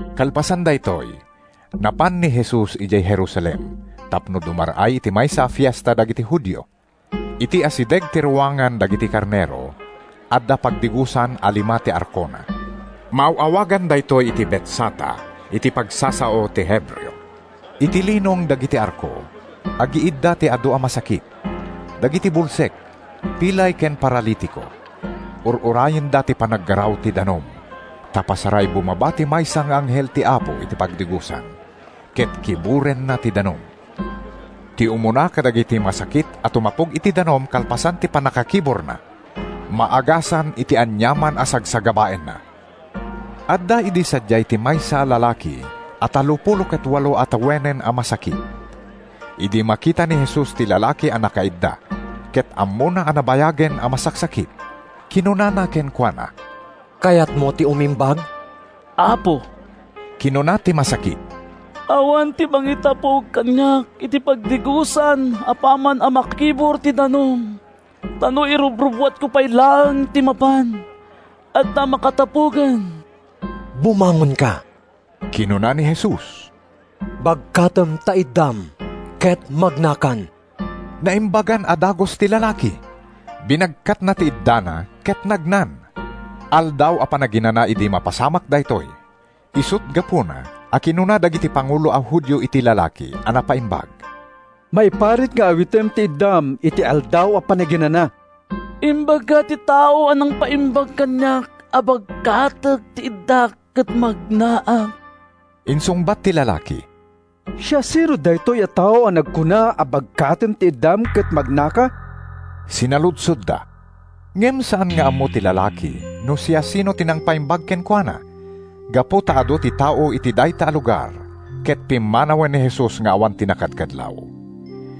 Kalpasan daytoy, napan ni Jesus idiay Jerusalem tapno dumar-ay iti maysa a fiesta dagiti Judio. Iti asideg ti Ruangan dagiti Karnero, adda pagdigosan a lima ti arkona. Maaw-awagan daytoy iti Betsata iti pagsasao ti Hebreo. Iti linong dagiti arko, agiidda ti adu a masakit: dagiti bulsek, pilay ken paralitiko. [Ur-urayenda ti panaggaraw ti danum, ta pasaray bumaba ti maysa nga anghel ti Apo iti pagdigosan ket kiburenna ti danum. Ti umuna kadagiti masakit a tumapog iti danum kalpasan ti pannakakiburna, maagasan iti aniaman a sagsagabaenna.] Adda idi sadiay ti maysa a lalaki a tallopulo ket walo a tawenen a masakit. Idi makita ni Jesus ti lalaki a nakaidda ket ammona a nabayagen a masaksakit, kinunana kenkuana, “Kayatmo ti umimbag?” “Apo,” kinuna ti masakit, “awan ti mangitapog kaniak iti pagdigosan apaman a makibur ti danum. Ta no irubrubbuatko pay laeng ti mapan, adda nakatapogen.” “Bumangonka,” kinuna ni Jesus. “Bagkatem ta iddam, ket magnakan.” Naimbagan a dagus ti lalaki. Binagkatna ti iddana ket nagnan. Aldaw a Panaginana idi mapasamak daytoy, isut’ gapuna a kinuna dagiti pangulo a Judio iti lalaki a napaimbag, “Maiparit nga awitem ti iddam iti Aldaw a Panaginana.” “Imbaga ti tao a nangpaimbag kaniak a bagkatek ti iddak ket magnaak,” insungbat ti lalaki. “Siasino daytoy a tao a nagkuna a bagkatem ti iddam ket magnaka?” sinaludsodda. Ngem saan nga ammo ti lalaki no siasino ti nangpaimbag kenkuana gapu ta adu ti tao iti dayta a lugar ket pimmanawen ni Jesus nga awan nakadkadlaw.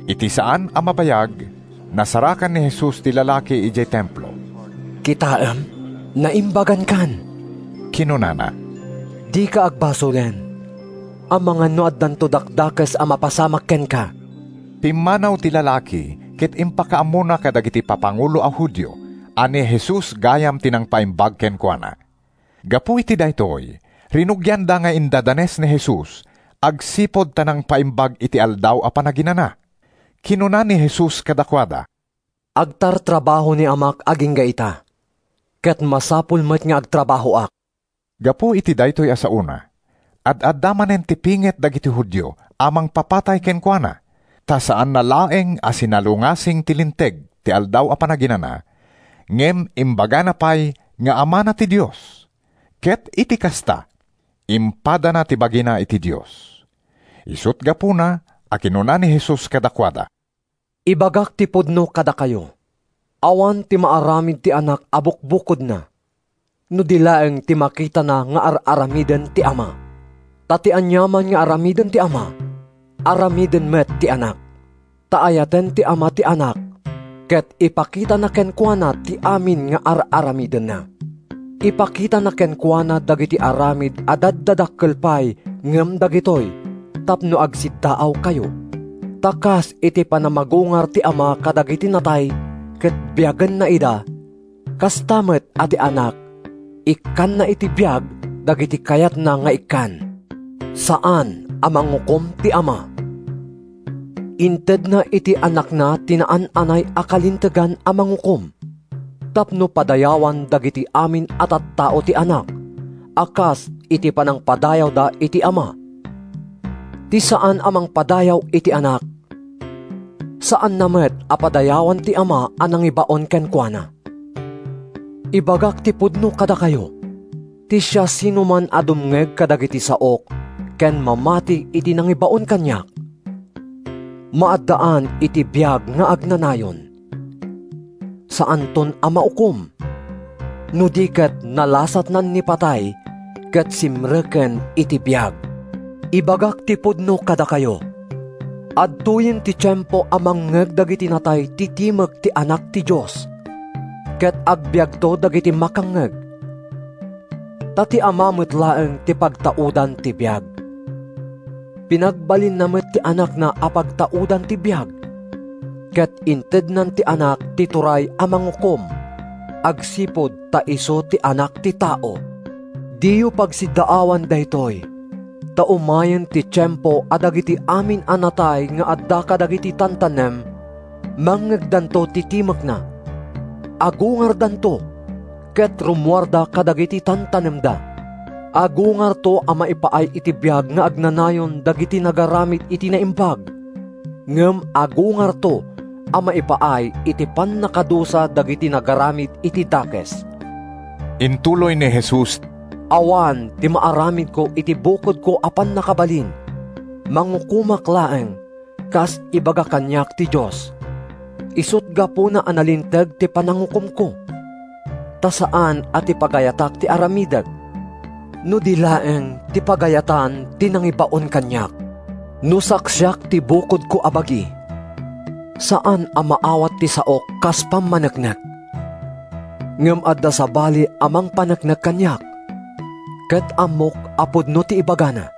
Iti saan a mabayag, nasarakan ni Jesus ti lalaki idiay Templo. “Kitaem, naimbagankan!” kinunana. “Dika agbasolen, amangan no addanto dakdakes a mapasamak kenka.” Pimmanaw ti lalaki ket impakaammona kadagiti papangulo a Judio a ni Jesus gayam ti nangpaimbag kenkuana. Gapu iti daytoy, rinugianda nga indadanes ni Jesus agsipud ta nangpaimbag iti Aldaw a Panaginana. Kinuna ni Jesus kadakuada, “Agtartrabaho ni Amak agingga ita, ket masapul met nga agtrabahoak.” Gapu iti daytoy a saona, ad-adda manen ti pinget dagiti Judio a mangpapatay kenkuana ta saanna laeng a sinalungasing ti linteg ti Aldaw a Panaginana, ngem imbagana pay nga Amana ti Dios, ket iti kasta, impadana ti bagina iti Dios. Isut’ gapuna a kinuna ni Jesus kadakuada, “Ibagak ti pudno kadakayo: Awan ti maaramid ti Anak a bukbukodna, no di laeng ti makitana nga ar-aramiden ti Ama. Ta ti aniaman nga aramiden ti Ama, aramiden met ti Anak. Ta ayaten ti Ama ti Anak ket ipakitana kenkuana ti amin nga ar-aramidenna. Ipakitana kenkuana dagiti aramid a daddadakkel pay ngem dagitoy, tapno agsiddaawkayo. Ta kas iti panamagungar ti Ama kadagiti natay ket biagenna ida, kasta met a ti Anak ikkanna iti biag dagiti kayatna nga ikkan. Saan a mangukom ti Ama. Intedna iti Anakna ti naan-anay a kalintegan a mangukom, tapno padayawan dagiti amin a tattao ti Anak a kas iti panangpadayawda iti Ama. Ti saan a mangpadayaw iti Anak, saanna met a padayawan ti Ama a nangibaon kenkuana. “Ibagak ti pudno kadakayo: Ti siasinoman a dumngeg kadagiti saok ken mamati iti nangibaon kaniak, maaddaan iti biag nga agnanayon. Saanton a maukom, no di ket nalasatnan ni patay ket simreken iti biag. “Ibagak ti pudno kadakayo: Adtoyen ti tiempo a mangngeg dagiti natay ti timek ti Anak ti Dios, ket agbiagto dagiti makangngeg. Ta ti Ama met laeng ti pagtaudan ti biag. Pinagbalinna met ti Anakna a pagtaudan ti biag. Ket intednan iti Anak ti turay a mangukom, agsipud ta isu ti Anak ti Tao. “Diyo pagsiddaawan daytoy, ta umayen ti tiempo a dagiti amin a natay nga adda kadagiti tantanem mangngegdanto ti timekna, agungardanto ket rummuarda kadagiti tantanemda. Agungarto a maipaay iti biag nga agnanayon dagiti nagaramid iti naimbag ngem agungarto a maipaay iti pannakadusa dagiti nagaramid iti dakes.” Intuloy ni Jesus: “Awan ti maaramidko iti bukodko a pannakabalin. Mangukomak laeng kas ibaga kaniak ti Dios, isut’ gapuna a nalinteg ti panangukomko, ta saan a ti pagayatak ti aramidek, no di laeng ti pagayatan ti nangibaon kaniak. “No saksiak ti bukodko a bagi, saan a maawat ti saok kas pammaneknek. Ngem adda sabali a mangpaneknek kaniak, ket ammok a pudno ti ibagana.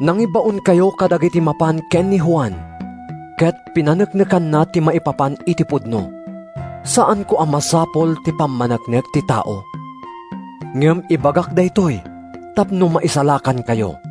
Nangibaonkayo kadagiti mapan ken ni Juan, ket pinaneknekanna ti maipapan iti pudno. Saanko a masapul ti pammaneknek ti tao, ngem ibagak daytoy tapno maisalakankayo.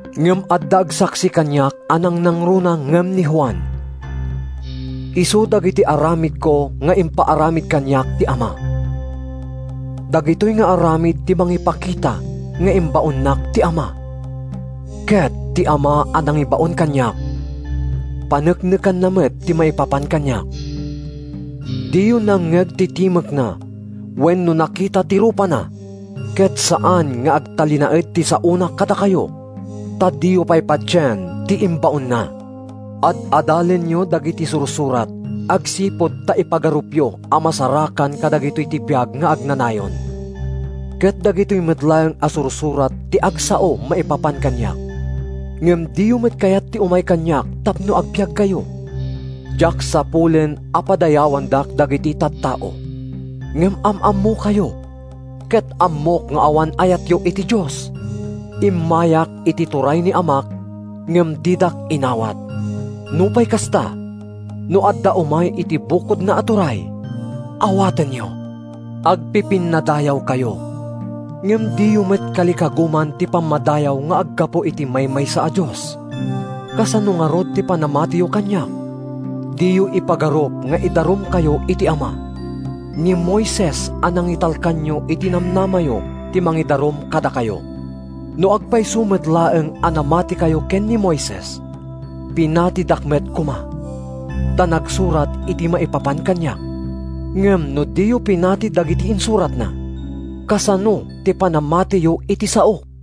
Ngem adda agsaksi kaniak a nangnangruna ngem ni Juan. Isu dagiti aramidko nga impaaramid kaniak ti Ama. Dagitoy nga aramid ti mangipakita nga imbaonnak ti Ama. Ket ti Ama a nangibaon kaniak, paneknekanna met ti maipapan kaniak. Diyo nangngeg ti timekna wenno nakita ti rupana ket saan nga agtalinaed ti saona kadakayo, ta diyo pay patien ti imbaonna. “Ad-adalenyo dagiti Sursurat agsipud ta ipagarupyo a masarakan kadagitoy ti biag nga agnanayon. Ket dagitoy met laeng a Sursurat ti agsao maipapan kaniak. Ngem diyo met kayat ti umay kaniak tapno agbiagkayo. “Diak sapulen a padayawandak dagiti tattao. Ngem am-ammokayo ket ammok nga awan ayatyo iti Dios. Immayak iti turay ni Amak ngem didak inawat. Nupay kasta, no adda umay iti bukodna a turay, awatenyo. “Agpipinnadayawkayo, ngem diyo met kalikaguman ti pammadayaw nga aggapu iti maymaysa a Dios. Kasano ngarud ti panamatiyo kaniak? Diyo ipagarup nga idarumkayo iti Ama. Ni Moises a nangitalkanyo iti namnamayo ti mangidarum kadakayo. No agpayso met laeng a namatikayo ken ni Moises, pinatidak met koma, ta nagsurat iti maipapan kaniak. Ngem no diyo pinati dagiti insuratna, kasano ti panamatiyo iti saok?”